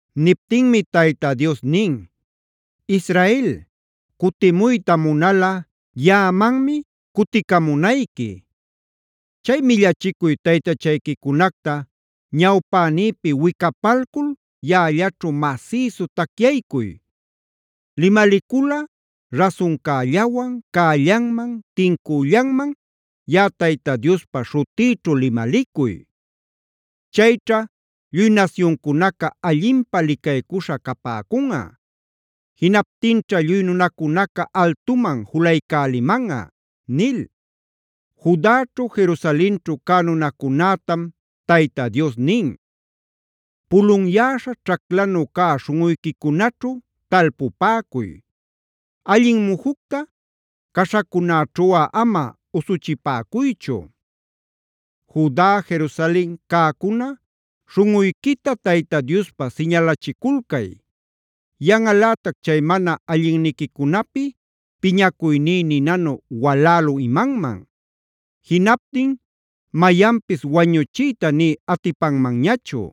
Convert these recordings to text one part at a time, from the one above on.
Niptinmi Tayta Dios nin: “Israel, cutimuyta munalꞌa yaꞌamanmi cuticamunayqui. Chay millachicuy taytachayquicunacta ñawpänïpi wicapalcul yaꞌallaćhu masïsu tacyaycuy. Limaliculꞌa rasuncällawan, cällanman, tincüllanman yaꞌa Tayta Diospa śhutïćhu limalicuy. Chayćha lluy nasyuncunaca allinpä licaycuśha capäcunꞌa; jinaptinćha lluy nunacunaca altuman julaycälimanꞌa” nil. Judaćhu, Jerusalenćhu cä nunacunätam Tayta Dios nin: “Pulunyäśha ćhaclanu cä śhunꞌuyquicunaćhu talpupäcuy;a allin mujucta caśhacunäćhuꞌa ama usuchipäcuychu. Juda, Jerusalen cäcuna, śhunꞌuyquita Tayta Diospä siñalachiculcay.b Yanꞌalätac chay mana allinniquicunapi piñacuyní ninanu walälü imanman. Jinaptin mayanpis wañuchiyta nï atipanmanñachu.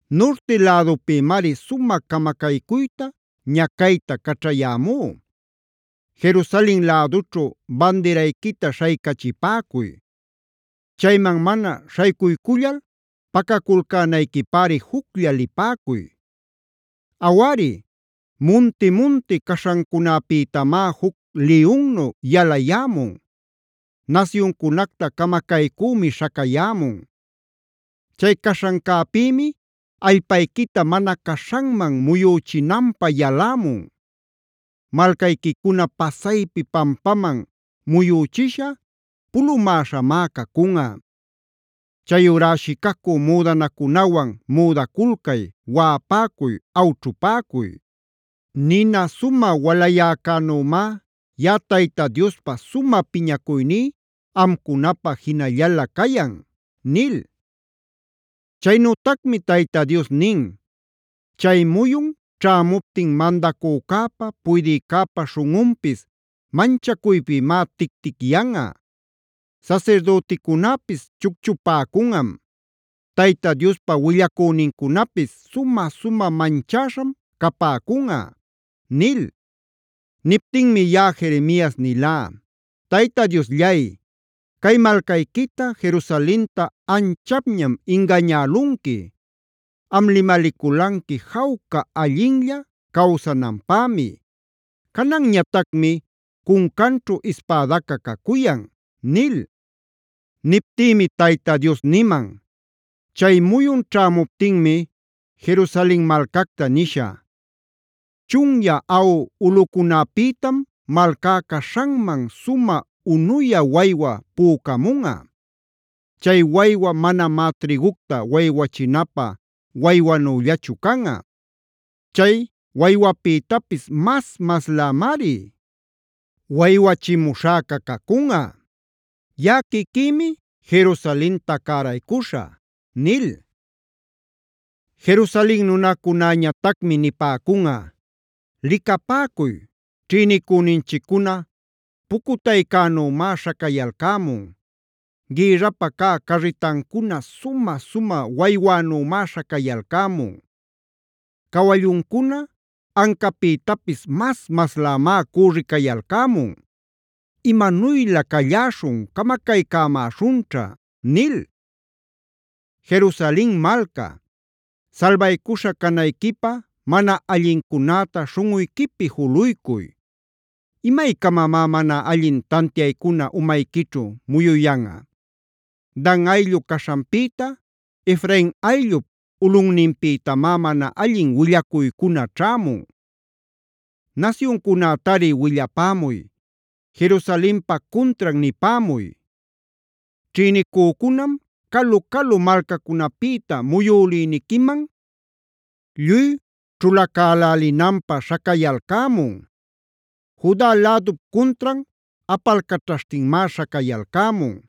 Nurti lädupïmari sumä camacaycuyta, ñacayta caćhayämú. Jerusalenc lädućhu bandirayquita śhaycachipäcuy; chayman mana śhaycuycullal pacaculcänayquipäri juclla lipäcuy. “Awari, munti-munti caśhancunäpïtamá juc liyunnu yalayämun; nasyuncunacta camacaycümi śhacayämun. Chay caśhancäpïmi allpayquita mana caśhanman muyüchinanpä yalämun. Malcayquicuna pasaypi pampaman muyüchisha, pulumäśhamá cacunꞌa. Chayurá shicacüd müdanacunawan müdaculcay, waꞌapäcuy, awćhupäcuy. Nina sumä walayäcänümá yaꞌaTayta Diospa sumä piñacuyní amcunapä jinallalä cayan” nil. ChaynütacmiTayta Dios nin: “Chay muyun ćhämuptin mandacücäpa, puydïcäpa śhunꞌunpis manchacuypïmá tic-ticyanꞌa. Sasirdüticunäpis chucchupäcunꞌam; Tayta Diospa willacünincunapis sumä-sumä manchäśham capäcunꞌa” nil. Niptinmi yaꞌa Jeremias nilá: “Tayta Diosllay, cay malcayquita, Jerusalenta anchapñam ingañälunqui. Am limaliculanqui jawca allinlla cawsananpämi; cananñatacmi cuncanćhu ispädaca cacuyan” nil. Niptïmi Tayta Dios niman: “Chay muyun ćhämuptinmi Jerusalen malcacta nishä: ‘Chunyä aꞌu ulꞌucunäpïtam malcá caśhanman, sumä unuyä waywa pücamunꞌa. Chay waywa manamá trïgucta waywachinapä waywanüllachu canꞌa. Chay waywapïtapis mas-maslämari waywachimuśhäca cacunꞌa. Yaꞌa quiquïmi Jerusalenta cäraycuśhä’” nil. Jerusalen nunacunäñatacmi nipäcunꞌa: “Licapäcuy, ćhïnicüninchiccuna pucutaycänümá śhacayalcämun. Gïrrapä cä carritancuna sumä-sumä waywänümá śhacayalcämun. Cawalluncuna ancapïtapis mas-maslämá cürricayalcämun. Imanuylä calläśhun; camacaycämäśhunćha” nil. Jerusalen malca, salbaycuśha canayquipä mana allincunäta śhunꞌuyquipi juluycuy. ¿Imaycamamá mana allin tantiaycuna umayquićhu muyuyanꞌa? Dan ayllu caśhanpïta, Efrain ayllup ulꞌunninpïtamá mana allin willacuycuna ćhämun. “Nasyuncunätari willapämuy, Jerusalenpa cuntran nipämuy: ‘Ćhïnicücunam calu-calu malcacunapïta muyülïniquiman lluy ćhulacälälinanpä śhacayalcämun. Juda lädup cuntran apalcaćhashtinmá śhacayalcämun.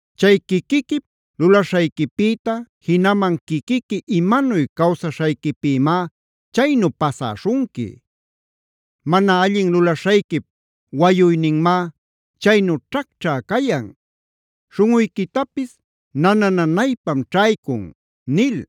“Chay quiquiquip lulaśhayquipïta, jinaman quiquiqui imanuy cawsaśhayquipïmá chaynu pasäśhunqui. Mana allin lulaśhayquip wayuyninmá chaynu ćhacćhä cayan; śhunꞌuyquitapis nana-nanaypam ćhaycun” nil.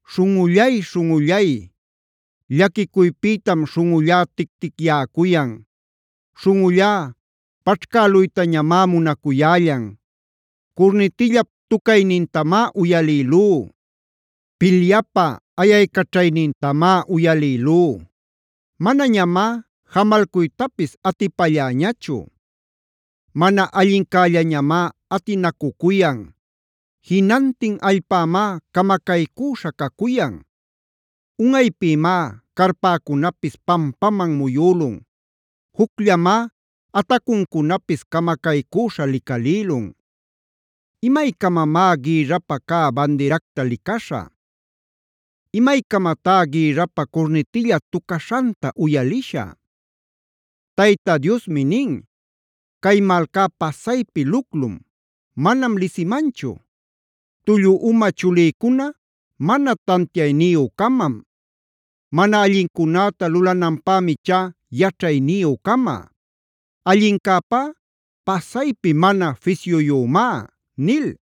¡Śhunꞌullay, śhunꞌullay! Llaquicuypïtam śhunꞌullá tic-ticyäcuyan. Śhunꞌullá paćhcäluytañamá munacuyällan. Curnitillap tucaynintamá uyalïlú, pilyapä ayaycaćhaynintamá uyalïlú. Manañamá jamalcuytapis atipalläñachu. Mana allincällañamá atinacucuyan; jinantin allpämá camacaycüśha cacuyan. Unꞌaypïmá carpäcunapis pampaman muyülun; jucllamá atacuncunapis camacaycüśha licalïlun. ¿Imaycamamá gïrrapä cä bandiracta licaśhä? ¿Imaycamatá gïrrapä curnitilla tucaśhanta uyalishä? Tayta Diosmi nin: “Cay malcá pasaypi luclum; manam lisimanchu. Tullu uma chulïcuna mana tantiayniyü-camam. Mana allincunäta lulananpämi ichá yaćhayniyü-cama; allincäpá pasaypi mana fisyuyümá” nil.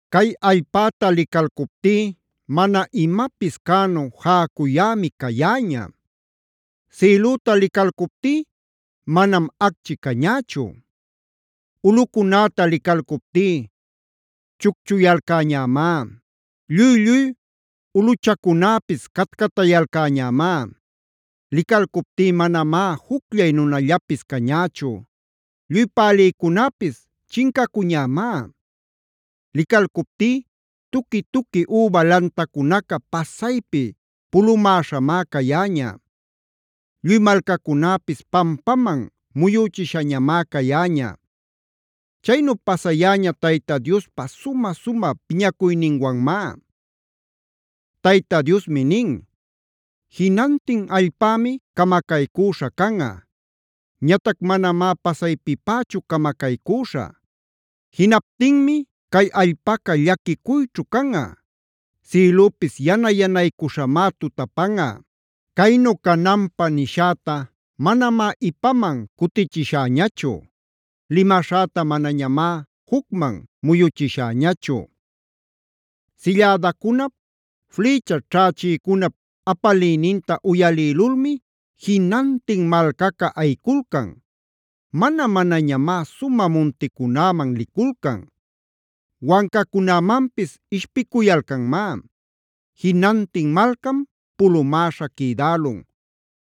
Cay allpäta licalcuptí mana imapis cänu jäcuyämi cayäña;e sïlüta licalcuptí manam acchi cañächu. Ulꞌucunäta licalcuptí chucchuyalcäñämá; lluy-lluy ulꞌuchacunäpis catcatayalcäñämá. Licalcuptí manamá jucllay nunallapis cañächu; lluy pälïcunäpis chincacuñämá. Licalcuptí tuqui-tuqui üba lantacunaca pasaypi pulumäśhamá cayäña; lluy malcacunäpis pampaman muyüchiśhañamá cayäña. Chaynu pasayäña Tayta Diospa sumä-sumä piñacuyninwanmá. Tayta Diosmi nin: “Jinantin allpämi camacaycüśha canꞌa; ñatac manamá pasaypipächu camacaycüśhä. Jinaptinmi cay allpaca llaquicuyćhu canꞌa; sïlüpis yana-yanaycuśhamá tutapanꞌa. Caynu cananpä nishäta manamá ipaman cutichishäñachu; limaśhäta manañamá jucman muyuchishäñachu. “Sillädacunap, flïcha ćhächïcunap apaliyninta uyalïlulmi jinantin malcaca ayiculcan. Mana-manañamá sumä munticunäman liculcan; wancacunämanpis ishpicuyalcanmá. Jinantin malcam pulumäśha quïdälun;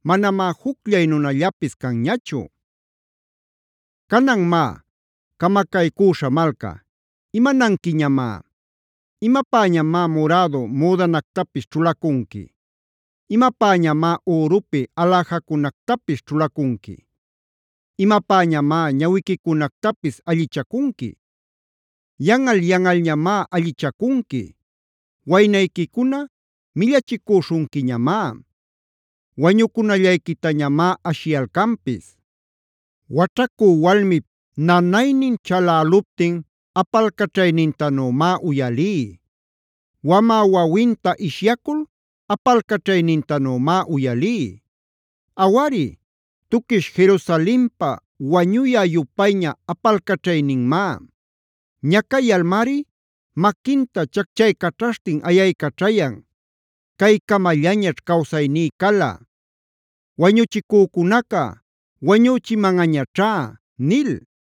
manamá jucllay nunallapis canñachu. “Canan má, camacaycüśha malca, ¿imananquiñamá? ¿Imapäñamá murädu müdanactapis ćhulacunqui? ¿Imapäñamá ürupi aläjacunactapis ćhulacunqui? ¿Imapäñamá ñawiquicunactapis allichacunqui? Yanꞌal-yanꞌalñamá allichacunqui; waynayquicuna millachicüśhunquiñamá; wañucunallayquitañamá ashiyalcanpis. “Waćhacü walmip nanaynin chaläluptin apalcaćhaynintanümá uyalí; wamä wawinta ishyacul apalcaćhaynintanümá uyalí. Awari, tuquish Jerusalenpaf wañuyä-yupayña apalcaćhayninmá; ñacayalmari maquinta chacchaycaćhaśhtin ayaycaćhayan: ‘Caycamallañaćh cawsayní cala; wañuchicücunaca wañüchimanꞌañaćhá’” nil.